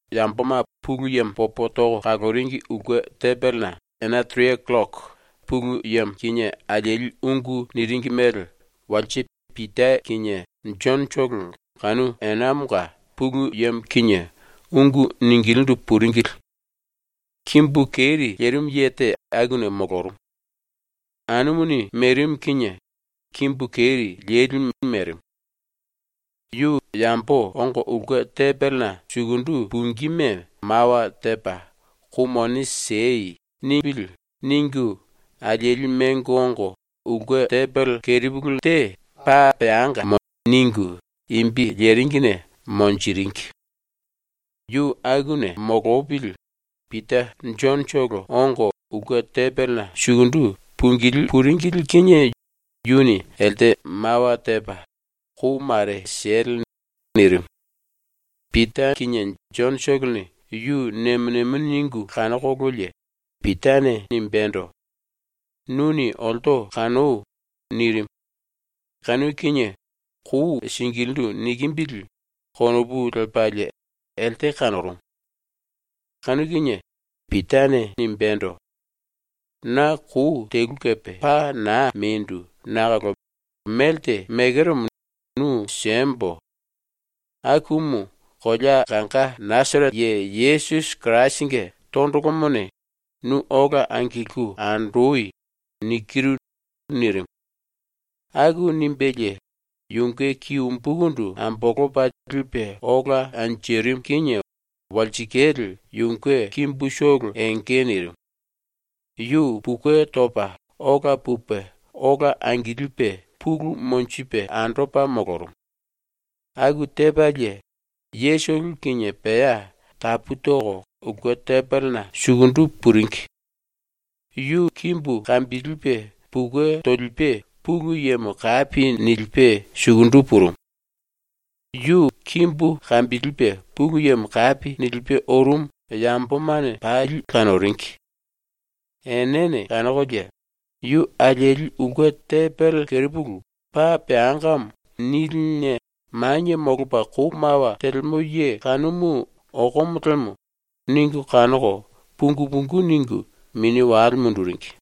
Yamboma ⸤Pulu Yemo popo toko kaloringi⸥ ulke tembelena ena tere killoko Pulu Yemo kinie alieli ungu niringi mele walse Pita kinie Jonotolo kanu enamonga Pulu Yemo kinie ungu ningilindu puringili. Kimbu keri lerimu ye te akuna molorumu. Anumuni merimu kinie kimbu keri lelimu merimu. ‘Yu yambo ongo ulke tembelena sukundu pungíme mawa tepa “Kou mone siei.” nipili.’ ningu alieli mengo ongo ulke tembele kerepulu te ‘Paa Peanga’ ningu imbi leringine monjiringi. Yu akuna molopili Pita Jonotolo ongo ulke tembelena sukundu pungilí puringili kinie yuni elte mawa tepa “Kou mare siele.” nirimu. Pita kinie Jonotolone yu nemo nemo ningu kanokololie Pitane nimbendo: “Nuni olto kanoi.” nirimu. Kanu kinie ‘Kou singilindu nikimbili.’ konopu lepalie elte kanorumu. Kanu kinie Pitane nimbendo: “Na kou telu kepe paa naa mendu nakolo melte mekeromo nu siembo. Akumu kolea kanga Nasarete Ye Yesusi Kirasinge tondolomone ‘Nu ola angilku andoi.’ nikiru.” nirimu. Aku nimbelie yunge ki umbukundu ambolopa lipe ola anjirimu kinie walsikale yunge kimbutolo enge nirimu. Yu pukue topa ola pupe ola angilipe pulu monjipe andopa molorumu. Aku tepalie yetolo kinie pea tapu toko ulke tembelena sukundu puringi. Yu kimbu kambilipe pukue tolipe Pulu Yemo kapi nilipe sukundu purumu. Yu kimbu kambilipe Pulu Yemo kapi nilipe orumu yambomane pali kanoringi. Enene kanokolie, ‘Yu alieli ulke tembele kerepulu ‘Paa Peangamo’ niline manie molopa kou mawa telemo ye kanumu okomo lemo.’ ningu kanoko pungu pungu ningu mini wale munduringi.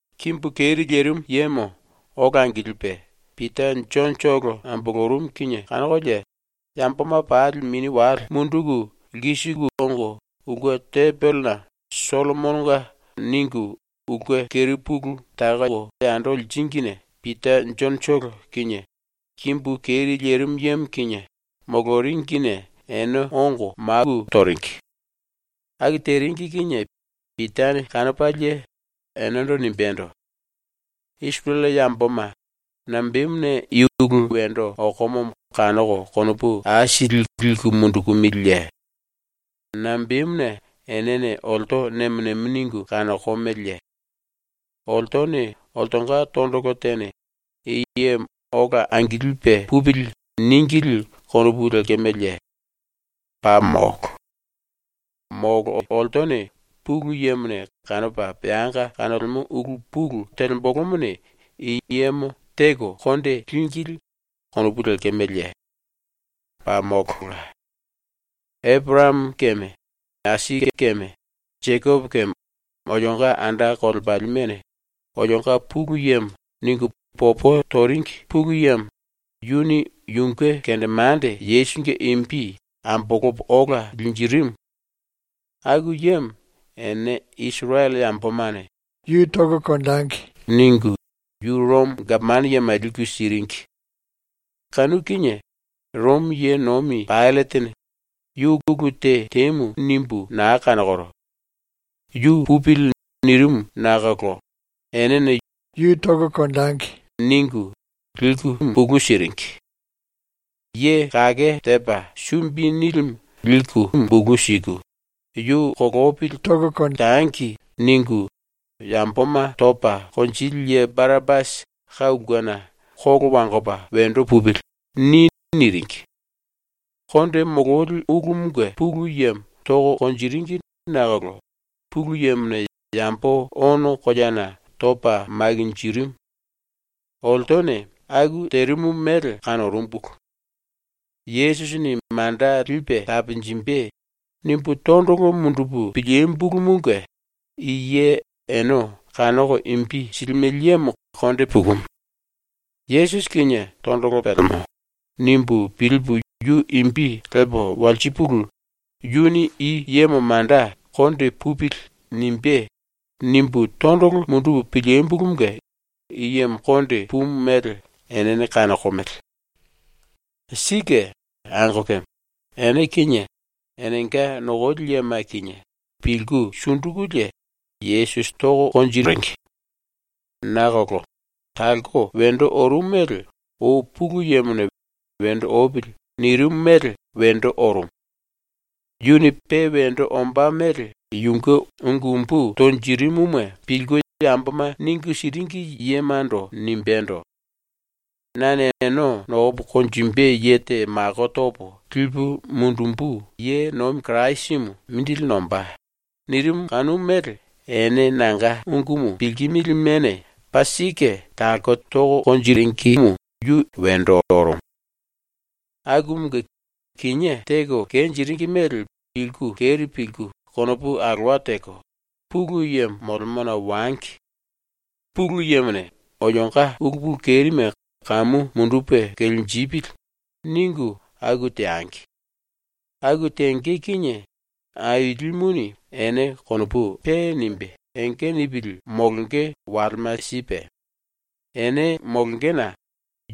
Kimbu keri lerimu yemo ola angilipe Pita Jonotolo ambolorumu kinie kanokolie yamboma pali mini wale munduku lkisiku ongo ulke tembelena ‘Sollomononga’ ningu ulke kerepulu takoko yando liringine Pita Jonotolo kinie kimbu keri lerimu yemo kinie moloringine ene ongo maku toringi. Aku teringi kinie Pitane kanopalie enendo nimbendo: “Isirele yamboma, nambemuna i ulu wendo okomomo kanoko konopu aisili liku mundukumiliye? Nambemuna enene olto nemo nemo ningu kanokomeleye? Oltone oltonga tondolo tene “I yemo ola angilipe pupili.” níngili konopu lekemeleye? Paa molo. Molo oltone Pulu Yemone kanopa peanga kanolemo ulu pulu telembolomone i yemo teko konde língili konopu lekemeleye? Paa molola. Eporayamo keme Aisake keme Jekopo keme olionga anda kolepalimene “Olionga Pulu Yemo.” ningu popo toringi Pulu Yemo, yuni yunge kendemande Yesusinge imbi ambolopa ola linjirimu. Aku yemo ene Isirele yambomane “Yu tangi.” ningu yu Romo gapomano yema liku siringi. Kanu kinie Romo ye nomi Paillatene “Yu ulu te temu nimbu naa kanokoro. Yu pupili.” nirimu nakolo enene “Yu tangi.” ningu liku bulu siringi. Ye Kake Tepa Sumbi Nilimu liku bulu siku, “Yu kolopili tangi.” ningu, yamboma topa konjili ye Barapasi ka ulkena “‘Kolo wangopa wendo pupili.’ ni.” niringi. Konde mololi ulumunge pulu yemo toko konjiringi nakolo Pulu Yemone yambo ono koleana topa makinjirimu. Oltone aku terimu mele kanorumbulu. ‘Yesusini manda lipe taponjimbe.’ nimbu tondolo mundupu pilímbulumunge i ye ene kanoko imbi silimele yemo konde pukumu. ‘Yesusi kinie tondolo pelemo.’ nimbu pilipu yu imbi lepo walsipulu, yuni i yemo manda ‘Konde pupili.’ nimbé.’ nimbu tondolo mundupu pilímbulumunge i yemo konde pumu mele enene kanokomele. “Sike, angokeme, ene kinie enenga nokoli yema kinie pilku sundukulie Yesusi toringi. Nakolo talko wendo orumu mele ou Pulu Yemone ‘Wendo opili.’ nirimu mele wendo orumu. Yuni pe wendo ombá mele yunge ungu umbu tonjirimuma pilku yamboma ningu siringi yemando nimbendo: “Nane ene nokopa konjimbe ye te mako topo lipu mundumbu ye nomi Kirasimu mindili nombá.” nirimu kanu mele ene nanga ungumu pilkimilimene paa sike talko teringi wendo orumu. “Akumunge, kinié teko kenjiringi mele pilku keri pilku konopu alowa teko, Pulu Yemo molemona wangi. ‘Pulu Yemone olionga ulu pulu kerime kamu mundupe kelenjipili.’ ningu aku teangi. Aku tenge kinie Ailimuni ene konopu pe nimbe enge nipili molonge walema sipe, ene molongena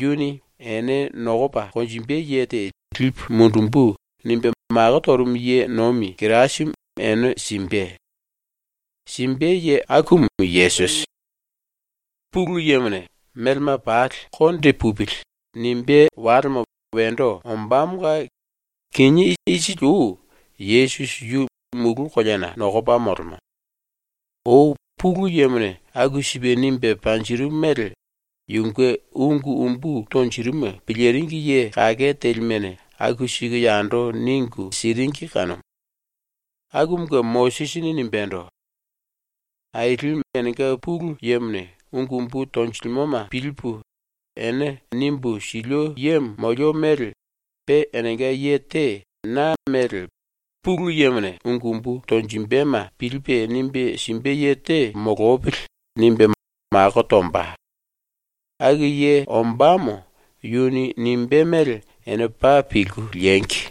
yuni “Ene nokopa konjimbe ye te lipu mundumbu.” nimbe mako torumu ye nomi Kirasimu ene simbe. Simbe ye akumu Yesusi. “Pulu Yemone ‘Melema pali konde pupili.’ nimbé walemo wendo ombámonga kinié isili ou Yesusi yu mulu koleana nokopa molemo. Ou Pulu Yemone aku sipe nimbe panjirimu mele yunge ungu umbu tonjirimuma piliringi ye kake telimene aku siku yando ningu siringi kanumu. Akumunge Mosisini nimbendo: “Ailimu enenga Pulu Yemone ungu umbu tonjilimoma pilipu ene nimbu silio yemo molio mele pe enenga ye te na mele ‘Pulu Yemone ungu umbu tonjimbema pilipe nimbe simbe ye te molopili.’ nimbe mako tomba. Aku ye ombámo yuni nimbé mele ene paa pilku liengi.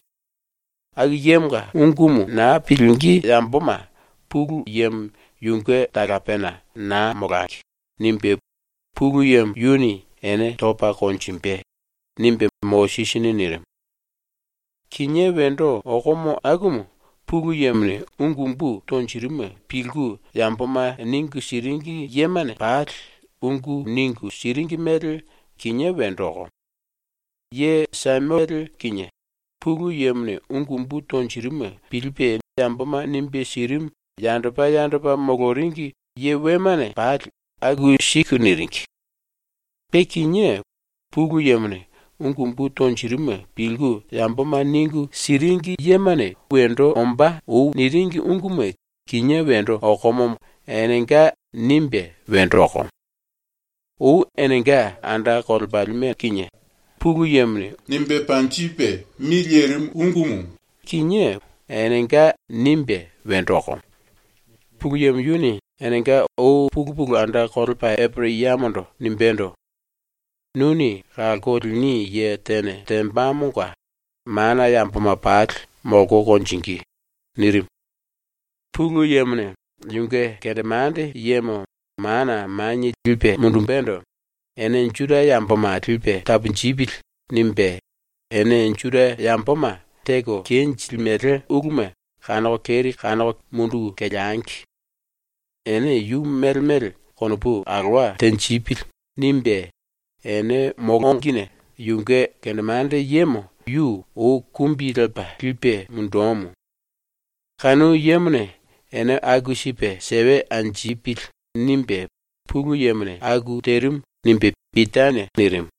Aku yemonga ungumu naa pilingí yamboma Pulu Yemo yunge talapena ‘Naa molangi.’ nimbe Pulu Yemo yuni ene topa konjimbe.” nimbe Mosisini nirimu. “Kinié wendo okomo akumu Pulu Yemone ungu umbu tonjirimuma pilku yamboma ningu siringi yemane pali ungu ningu siringi mele kinié wendo okomo. Ye Samuele kinie, Pulu Yemone ungu umbu tonjirimuma pilipe yamboma nimbe sirimu yandopa yandopa moloringi ye wemane pali aku siku niringi. Pe kinié Pulu Yemone ungu umbu tonjirimuma pilku yamboma ningu siringi yemane ou wendo ombá niringi unguma kinie wendo okomomo ‘Enenga.’ nimbe wendo okomo. Ou enenga anda kolepalime kinie Pulu Yemone nimbe panjipe mi lerimu ungumu kinie ‘Enenga.’ nimbe wendo okomo. Pulu Yemo yuni enenga ou pulu pulu anda kolepa Eporayamondo nimbendo: “Nuni kalko lini ye tene tembamonga mana yamboma pali molko konjingí.” nirimu. Pulu Yemone yunge kendemande yemo mana manie lipe mundumbendo ‘Ene Juda yamboma lipe taponjipili.’ nimbe ‘Ene Juda yamboma teko kenjilimele uluma kanoko keri kanoko munduku keleangi. Ene yu mele mele konopu alowa tenjipili.’ nimbe ene molongine yunge kendemande yemo yu ou kumbi lepa lipe mundumu. ‘Kanu yemone ene aku sipe sewe anjipili.’ nimbe Pulu Yemone aku terimu.” nimbe Pitane nirimu.